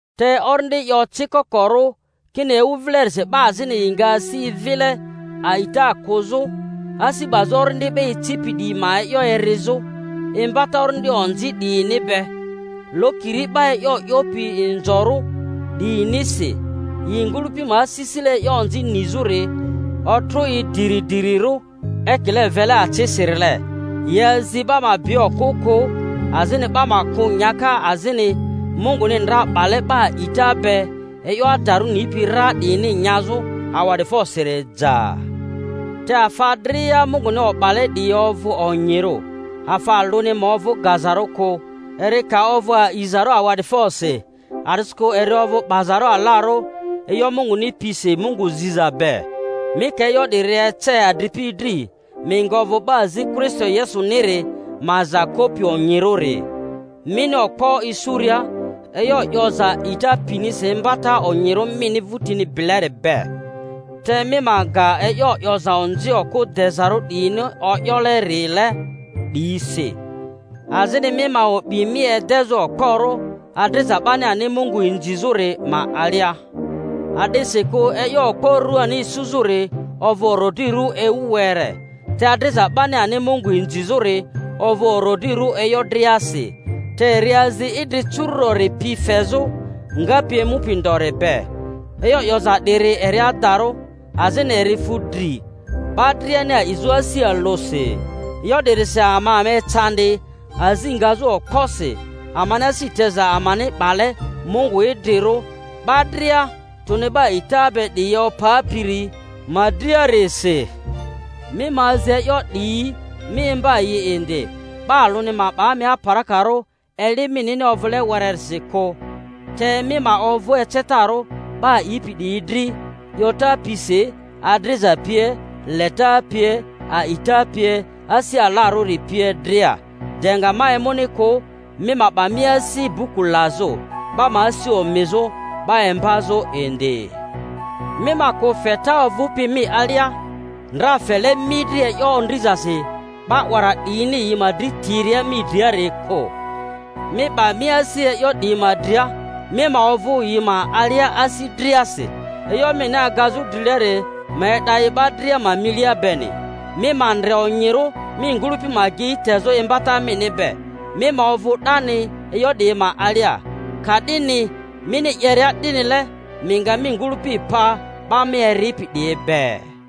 Te Orindi 'yo ocikokorᴜ, kini ewu vilerisi 'ba azini yi nga asi vile a'ita kᴜzᴜ, asi 'bazᴜ orindi 'ba icipi 'diyi ma e'yo erizᴜ, imbata orindi onzi 'diyini be, lokiri 'ba e'yo 'yopi inzorᴜ 'diyinisi, yi ngᴜlᴜpi ma asisile e'yo onzi nizᴜri otrᴜ i diri-dirirᴜ ekile vele acisirile; yi azi 'ba ma bi okᴜ kᴜ, azini 'ba ma kᴜ nyaka azini Munguni ndra 'bale 'ba a'ita be e'yo adarᴜ nipi ra 'diyini nyazᴜ awa'dIfosiri ja. Te afa dria Munguni o'bale 'diyi ovᴜ onyirᴜ, afa alᴜni ma ovᴜ gazarᴜ kᴜ, eri ka ovᴜ aizarᴜ awa'difosi; a'disikᴜ eri ovᴜ 'bazarᴜ alarᴜ e'yo Munguni pisi Mungu ziza be. Mi ka e'yo 'diyi ece adripi dri, mi nga ovᴜ 'ba azi Kristo Yesuniri ma aza kopi onyirᴜri, mini okpo isuria e'yo 'yoza a'ita pinisi imbata onyirᴜ mini vᴜtini bileri be. Te mi ma ga e'yo 'yoza onzi okᴜ dezarᴜ 'diyini o'yolerile 'diyi si. Azini mi ma o'bi mi edezᴜ okporᴜ adriza 'bani ani Mungu inzizᴜri ma alia; a’disikᴜ e'yo okpo ruani isuzᴜri ovᴜ orodrirᴜ ewu were, te adriza 'bani ani Mungu inzizᴜri ovᴜ orodrirᴜ e'yo driasi, te eri azi idri curu'dori pi fezᴜ, ngapi emupi ndori be. E'yo 'yoza 'diri eri adarᴜ, azini eri fu dri 'ba driani a'izᴜ asi alᴜsi. E'yo 'dirisi ama ama ecandi, azi ngazᴜ okposi, amani asi teza amani 'bale Mungu idrirᴜ, 'ba dria tᴜni 'ba a'ita be 'diyi opapiri ma driarisi. Mi ma azi e'yo 'diyi, mi imba yi indi. 'Ba alᴜni ma 'ba mi aparakarᴜ eli minini ovᴜle wererisi kᴜ, te mi ma ovᴜ ecetarᴜ 'ba a'ipi 'diyi dri, 'yota pisi, adriza pie, leta pie, a'ita pie, asi alarᴜri pie dria. De nga ma emuni kᴜ, mi ma 'ba mi asi buku lazᴜ, 'ba ma asi omizᴜ, 'ba imbazᴜ indi. Mi ma kᴜ feta ovᴜpi mi alia, ndra fele mi dri e'yo ondrizasi 'ba 'wara 'dryini yi ma dri tiria mi driariari kᴜ. Mi 'ba mi asi e'yo 'diyi ma dria, mi ma ovᴜ yi ma alia asi driasi, e'yo mini agazᴜ drileri ma e'da i 'ba dria ma milia beni. Mi ma ndre onyirᴜ mi ngᴜlᴜpi ma agei tezᴜ imbata mini be; mi ma ovᴜ 'dani e'yo 'diyi ma alia, ka'dini mini 'yeria 'dinile mi nga mi ngᴜlᴜpi pa 'ba mi eripi 'diyi be.